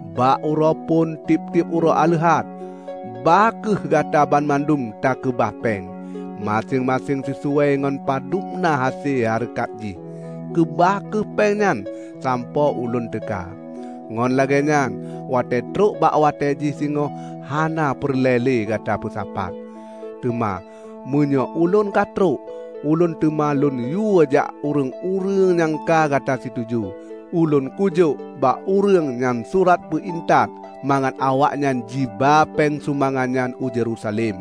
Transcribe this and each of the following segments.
Bak uroe phon tieb-tieb uroe aleuhat, bah kheueh Gata banmandum takeubah péng, maséng-maséng sisuai ngon padubna hase hareukat jih. Keubah kheueh péng nyan sampoe ulôn teuka, ngon lagée nyan watée trok bak watée jih singoh hana peureulée le gata peusapat. Teuma meunyoe ulôn ka trok, ulôn teuma lôn yue jak ureuëng-ureuëng nyang ka gata situju. Ulôn kujok bak ureuëng nyan surat peu intat, mangat awaknyan jiba péng sumbangan nyan u Yerusalem.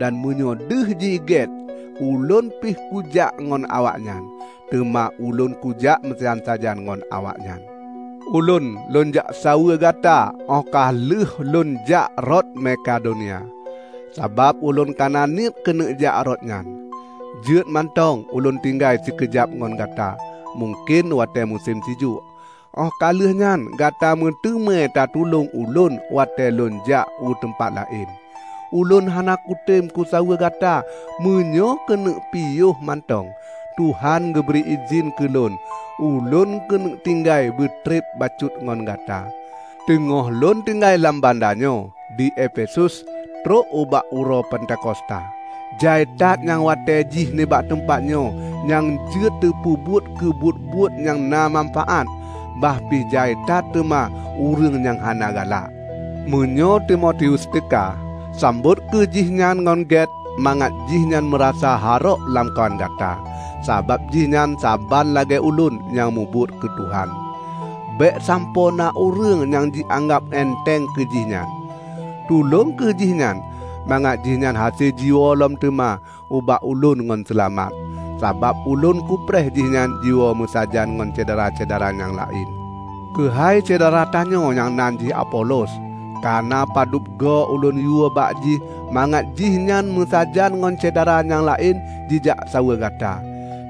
Dan meunyoe deuh jih gét ulôn pih kujak ngon awaknyan, teuma ulôn kujak meusajan-sajan ngon awaknyan. Ulôn lôn jaksaweue gata óh ka lheueh lôn jak rot Mekadonia, sabab ulôn kana niet keuneuk jak rot nyan. Jeuet mantong ulôn tinggai sikeujab ngon gata, mungken watée musém sijuek. Óh ka lheueh nyan gata meuteumé tatulông ulôn watée ulôn jak u teumpat laén. Ulôn hana kutem kusaweue gata meunyoe keuneuk piôh mantong. Tuhan geubri idhin keulôn, ulôn keuneuk tinggai beutreb bacut ngon gata. Teungoh lôn tinggai lam banda nyoe, di Efesus, trok ubak uroe Pentakosta. Jai that nyang watée jih nibak teumpat nyoe nyang jeuet teupeubuet keu buet-buet nyang na manfaát, bah pi jai that teuma ureuëng nyang hana galak. Meunyoe Timotius teuka, sambot kheueh jihnyan ngon gét mangat jihnyan meurasa harok lamkawan gata, sabab jihnyan saban lagée ulôn nyang mubuet keu Tuhan. Bék sampoe na ureuëng nyang jianggab enteng keu jihnyan. Tulông kheueh jihnyan mangat jihnyan hase jiwoe lom teuma ubak ulôn ngon seulamat, sabab ulôn kupreh jihnyan jiwoe meusajan ngon syedara-syedara nyang laén. Keuhai syedara tanyoe nyang nan jih Apolos, kana padub goe ulôn yue bak jih mangat jihnyan meusajan ngon syedara nyang laén jijak saweue gata.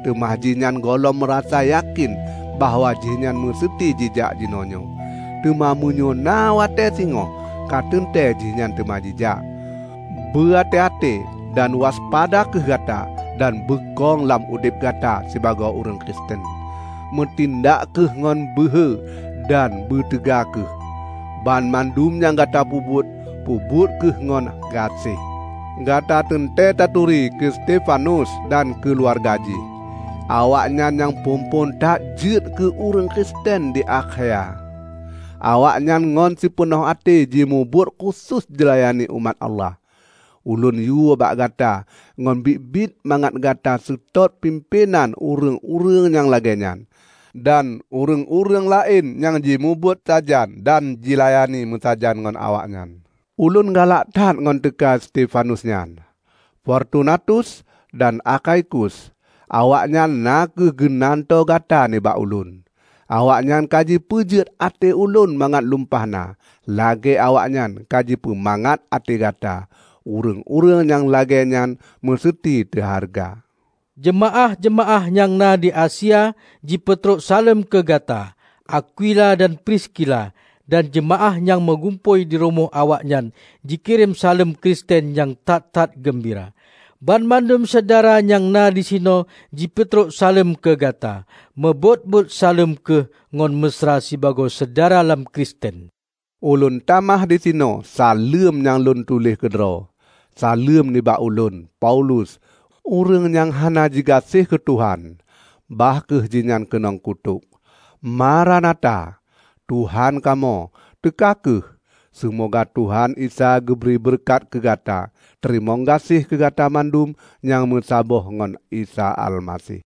Teuma jihnyan gohlom meurasa yakén bahwa jihnyan meuseuti jijak jinoenyoe. Teuma meunyoe na watée singoh, ka teuntée jihnyan teuma jijak. Beuaté-até dan waspada kheueh gata dan beukong lam udeb gata sibagoe ureuëng Kristen. Meutindak kheueh ngon beuhe dan beuteuga kheueh. Banmandum nyang gata peubuet, peubuet kheueh ngon gaséh. Gata teuntée taturi keu Stefanus dan keuluwarga jih; awaknyan nyang phon-phon that jeuet keu ureuëng Kristen di Akhaya. Awaknyan ngon sipeunoh até jimubuet khusos jilayani umat Allah. Ulôn yue bak gata ngon biet-biet mangat gata seutôt pimpénan ureuëng-ureuëng nyang lagée nyan, dan ureuëng-ureuëng laén nyang jimubuet sajan dan jilayani meusajan ngon awaknyan. Ulôn galak that ngon teuka Stefanus nyan, Fortunatus dan Akhaikus. Awaknyan na kheueh geunantoe gata nibak ulôn. Awaknyan ka jipeujeuet até ulôn mangat lumpah na, lagée awaknyan ka jipeumangat até gata. Ureuëng-ureuëng nyang lagée nyan meuseuti teuhareuga. Jeumaáh-jeumaáh nyang na di Asia jipeutrok saleuem keu gata. Akwila dan Priskila dan jeumaáh nyang meugumpôi dirumoh awaknyan jikirém saleuem Kristen nyang that-that geumbira. Banmandum syedara nyang na disinoe jipeutrok saleuem keu gata. Meubôt-bôt saleuem kheueh ngon meusra sibagoe syedara lam Kristen. Ulôn tamah disinoe saleuem nyang lôn tuléh keudroe: saleuem nibak ulôn, Paulus. Ureuëng nyang hana jigaséh keu Tuhan, bah kheueh jihnyan keunong kutok! Maranatha -- Tuhan kamoe, teuka kheueh! Seumoga Tuhan Isa geubri beureukat keu Gata. Teurimong gaséh keu gata mandum nyang meusaboh ngon Isa Almaseh.